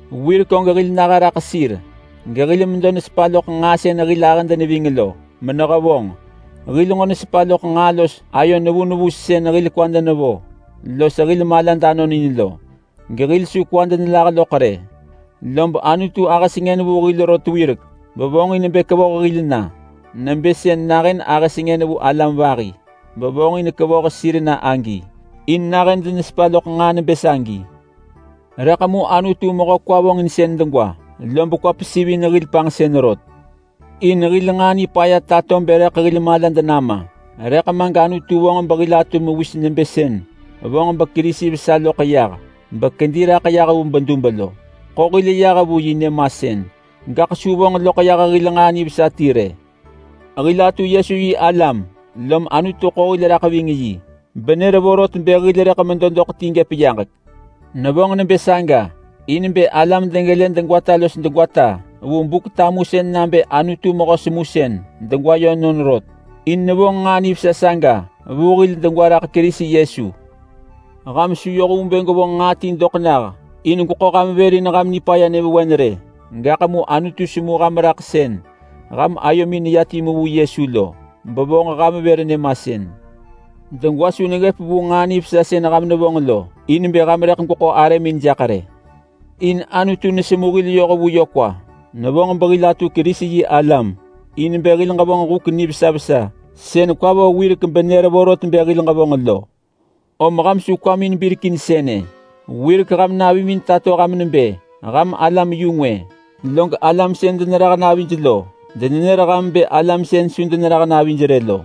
Wirek og hil naha raḳ sir gehil medo nesepa loḳ nġaa sën hil ahëd neving lo menehevonġ. Hil nġo nesepa loḳ nġaa los ayo nevu nevu sën hil kwad nevo los hil malad anonin lo, gehil su kwad nelah loḳ rë. Lob Anutu ahë sengën vu hil rot wirek bevonġin bë kevoh hil na. Nebë sën nahën ahë sengën vu alam vahi bevonġin kevoh sir na agi, in nahën denesepa loḳ nġaa nebë sagi. Rëḳ mu Anutu mehö kwa vonġinsën degwa lob kwa pesivin hil panġsën rot. In hil nġaa nipaya tato bë hil rëḳ malad nama, rëḳ ma gAnutu vonġ behil atu mewis nebë sën vonġ beKerisi vesa loḳ yah bekedi raḳ yah vu bedub lo. Ḳo hil yah vu yi nyëmasën, gaḳ su vonġ loḳ yah hil nġaa nivesa ti rë. Hil atu Yesu-yi-alam lom Anutu ḳo hil raḳ ving yi benër vorot bë hil rëḳ medo doḳ ti gëp yaġek. Nevonġ nebë saga in bë alam degelë degwata los degwata vu Buk-tamusën nabë Anutu mehö semusën degwa yönon rot, in nevonġ nġaa nivesa saga vu hil degwa raḳ Kerisi Yesu. Ham su yoh vu bë gwevonġ nġaa ti doḳ nah in gweḳo ham vër in ham nipaya nyëvewen rë. Gaḳ mu Anutu semu ham raḳ sën ham ayomin neya timu vu Yesu lo, bevonġ ham vër nyëmasën. Degwa su neggëp vu nġaa nivesa sën ham nevonġ lo in bë ham rëḳ gweḳo arëmin jaḳ rë. In Anutu nesemu hil yoh vu yö kwa. Nevonġ behil atu Kerisi-yi-alam in bë hil ġevonġ huk nivesa vesa sën kwa vo wirek benër vorot bë hil ġevonġ lo. Om ham su kwamin birek in sënë: Wirek ham navimin tato ham nebë ham alam-yu-ngwë. Log alam sën denerah navij lo denenër ham bë ‘alam sën su denerah navij rë’ lo.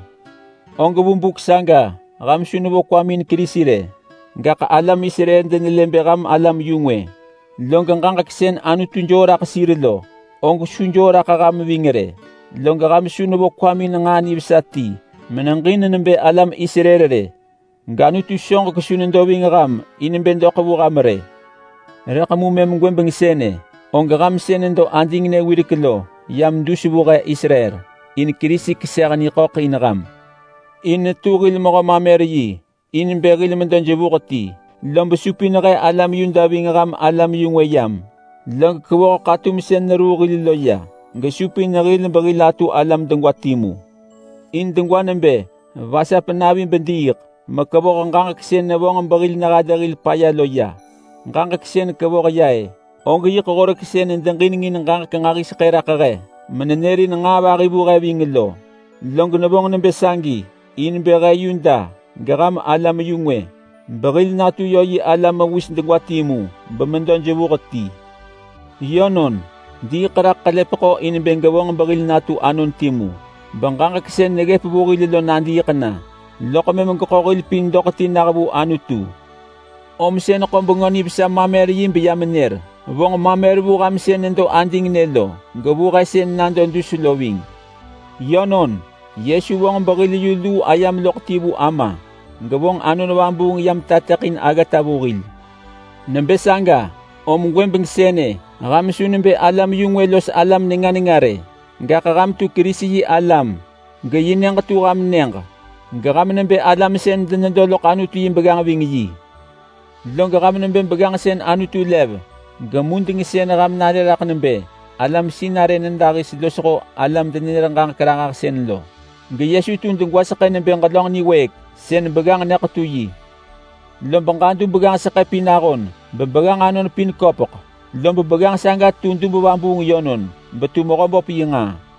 Og vu buk saga ham su nevo kwamin in Kerisi rë, gaḳ alam Israel denelë bë ham alam-yu-ngwë, log ġaġek sën Anutu joo raḳ sir lo, og su joo raḳ ham ving rë. Log ham su nevo kwamin in nġaa nivesa ti meneġin nebë alam Israel rë, gAnutu soġek su nedo ving ham in bë doḳ vu ham rë. Rëḳ mu mëm gwëbeng sënë og ham sën nedo adingnë wirek lo yam dus vu he Israel, in Kerisi keseh niḳöḳ in ham. In netu hil mehö-mamer-yi in bë hil medo jevuh ti, lob supin he alam Yuda ving ham alam-yu-ngwë yam. Log kevoh ḳatum sën neruu hil lo ya gesupin hil behil atu alam degwa timu. In degwa nebë vasap navi bediiḳ mekevoh ġaġek sën nevonġ behil nehalë hil paya lo ya. Ġaġek sën kevoh ya-ë, og yiḳ Horek sën nedeġinengin ġaġek nġahiseḳë raḳ he menenërin nġaa vahi vu he ving lo. Log nevonġ nebë sagi in bë he Yuda geham alam-yu-ngwë behil natu yö yi alam mewis degwa timu bemedo jevuh ti. Yönon, diiḳ raḳ ḳelepeḳo in bë gevonġ behil natu anon timu beġaġek sën neggëp vu hil lo nadiiḳ na, loḳ mëm geḳo hil pin doḳ ti nah vu Anutu. Om sën ḳo Bengö Nivesa mamer-yi beyam nër. Vonġ mamer vu ham sën nedo adingnë lo, gevu he sën nado dus lo ving. Yönon, Yesu vonġ behil yu luu ayam loḳ ti vu Ama, gevonġ Anon Vabuung yam tateḳin aggata vu hil. Nebë saga om gwëbeng sënë ham su nebë alam-yu-ngwë los alam nenga nenga rë. Gaḳ ham tu Kerisi-yi-alam geyi nyëġ tu ham nyëġ, geham nebë alam sën denedo loḳ Anutu yi begganġ ving yi. Log ham nebë begganġ sën Anutu lev, gemudeng sën ham nare raḳ nebë alam sinarë nyëdahis losho alam-denenër-ġaġek-ranġahsën. GeYesu tu degwaseḳë nebë ġelönġ niwëëk sën begganġ nyëḳetu yi. Lob ġadu begganġ seḳë pin ahon bebegganġ anon pin köpeḳ, lob begganġ saga tu dub vabuung yönon betu Mehöböp yi nġaa.